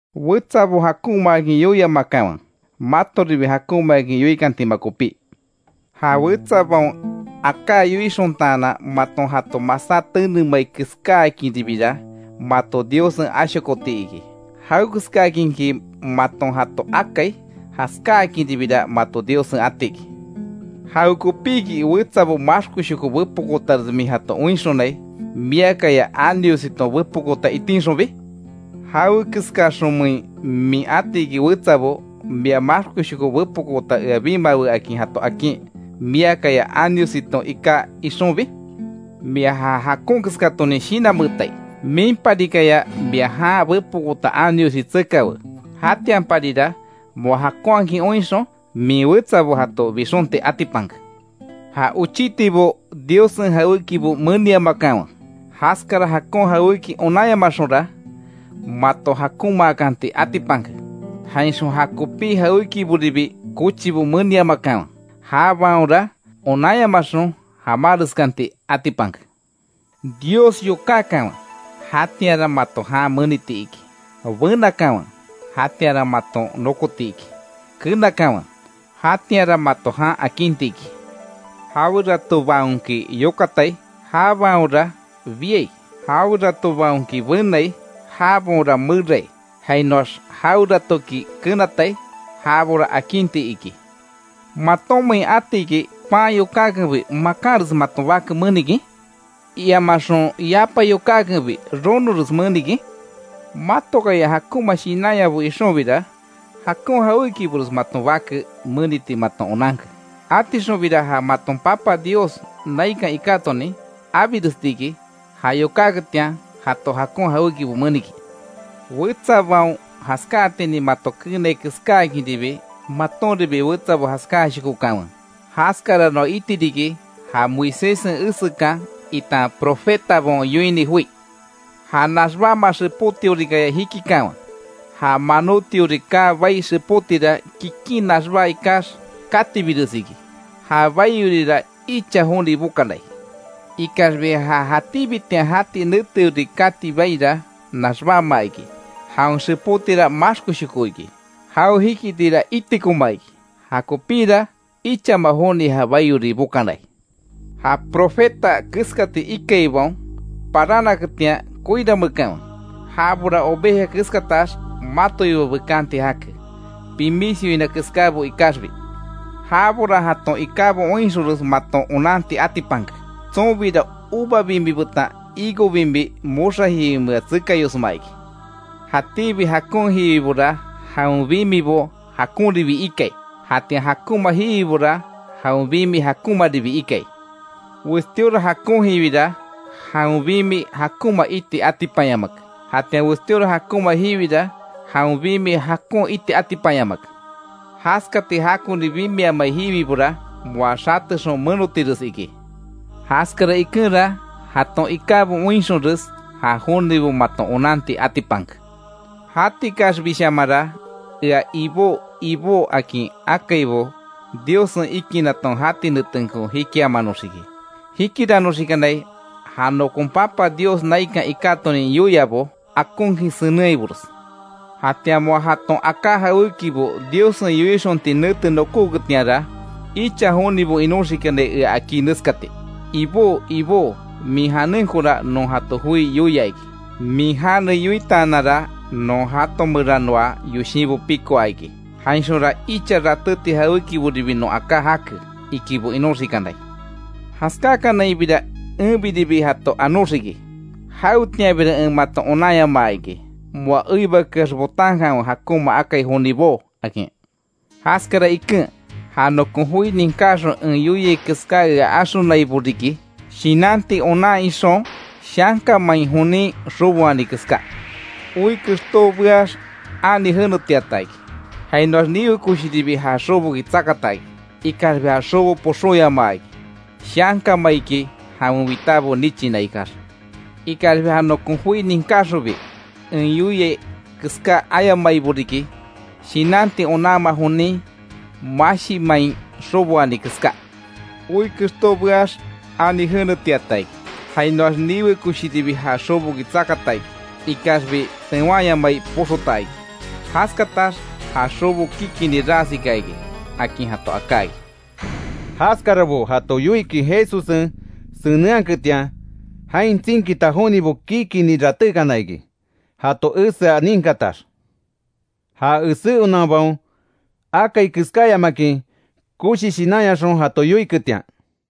Wetsabo jakonmaakin yoiamakanwe, matoribi jakonmaakin yoikantima kopí. Ja wetsabaon aká yoixontaanan maton jato masá tenemai keskáakinribira mato Diossen ashokoti iki. Jawekeskaakinki maton jato akai, jaskáakinribira mato Diossen ati iki. ¿Jawekopíki, wetsabo maxkoshoko bepokootares min jato oinxonai, miakaya aniositon bepokoota itinxonbi? ¿Jawe keskaxonmein min atiki wetsabo: ‘Mia maxkoshoko bepokoota ea bimawe’, akin jato akin, miakaya aniositon iká ixonbi? ¡Mia ja jakon keskatonin shinanmeetai! Minparikaya mia jan bepokoota aniosi tsekawe, jatianparira moa jakonhakin oinxon, min wetsabo jato bixonti atipanke. Ja ochitibo Diossen jawékibo meniamakanwe, jaskara jakon jawéki onanyamaxonra, mato jakonmaakanti atipanke. Jainxon ja kopí jawékiboribi kochibo meniamakanwe, jabaonra onanyamaxon jamáreskanti atipanke. Dios yokákanwe, jatianra mato jan meniti iki; benakanwe, jatianra maton nokotiki; kenakanwe, jatianra mato jan akinti iki. Jaweratobaonki yokatai, jabaonra biai; jaweratobaonki benai, jabaonra merai; jainoax jaweratoki kenatai, jabora akinti iki. ¿Matonmein atiki, pan yokákenbi makanres maton bake menikin? ¿Iamaxon, yapa yokákenbi ronores menikin? Matokaya jakonma shinanyabo ixonbira, jakon jawékibores maton bake meniti maton onanke. Atixonbira ja maton Papa Dios naikan ikátonin abirestiki, ja yokákanketian jato jakon jawékibo menikin. Wetsabaon jaskáatinin mato keenai keskáakinribi, matonribi wetsabo jaskáashokokanwe. Jaskara noa iti riki ja Moiséssen esekan itan profetabaon yoini joi. Ja naxbáma xepótiorikaya jikikanwe, ja manótiori kaa bai xepótira, kikin naxbá ikax katibires iki; ja baiorira icha joni bokanai. Ikaxbi ja jatíbitian jati neteori kati baira naxbáma iki, jawen xepótira maxkoshoko iki, jao jikitira itikoma iki, jakopíra ichama joni ja baiori bokanai. Ja profeta keskati ikaibaon parannaketian koirameekanwe. Jabora oveja keskatax matoiba bekanti jake pimis yoina keskábo ikaxbi. Jabora jaton ikábo oinxonres maton onanti atipanke, tsonbira uva bimi betan higo bimi, moxa jiwimea tsekayosma iki. Jatíbi jakon jiwibora, jawen bimibo jakonribi ikai, jatian jakonma jiwibora jawen bimi jakonmaribi ikai. Westíora jakon jiwira, jawen bimi jakonma iti atipanyamake. Jatian westíora jakonma jiwira, jawen bimi jakon iti atipanyamake. Jaskati jakoni bimiamai jiwibora, moa xatexon menotires iki. Jaskara ikenra, jaton ikábo oinxonres ja jonibo maton onanti atipanke. Jatikaxbishamanra ea ‘Ibó, Ibó’, akin akaibo Diossen ikinaton jati netenko jikiamanoxiki. Jikiranoxikanai ja nokon Papa Dios naikan ikátonin yoiabo akonkin senenhaibores. Jatian moa jaton aká jawékibo Diossen yoixonti nete nokóketianra, icha jonibo inoxikanai ea akí neskati: ‘Ibó, Ibó min janenkora non jato joi yoia iki, min jane yoitaananra non jato meranoa yoshinbo pikoa iki, jainxonra icha ratéti jawékiboribi non aká jake, ikibo inoxikanai’. Jaskákanainbira enbiribi jato anóxiki: ‘¡Jawetianbira en mato onanyamaa iki, moa eibakeax botankanwe jakonma akai jonibo!’ akin. Jaskara iken, ja nokon joi ninkáxon en yoia keská ea axonaibo riki, shinanti onan ixon shanka main jonin xoboani keská. Oi kexto beax ani jenetiata iki, jainoax niwe koshiribi ja xoboki tsakata iki; ikaxbi ja xobo poxóyamaa iki shanka maiki jawen witábo nichina ikax. Ikaxbi ja nokon joi ninkáxonbi, en yoia keská ayamaibo riki, shinanti onanma jonin mashi main xoboani keská. Oi kexto beax ani jenetiata iki, jainoax niwe koshiribi ja xoboki tsakata iki, ikaxbi tewanyamai poxota iki. Jaskatax ja xobo kikini ras ika iki”, akin jato aká iki. Jaskarabo jato yoikin Jesussen senenhaketian, jain tsinkita jonibo kikini ratékana iki jato esea ninkatax, ja esé onanbaon akai keskáayamakin, koshi shinanyaxon jato yoiketian.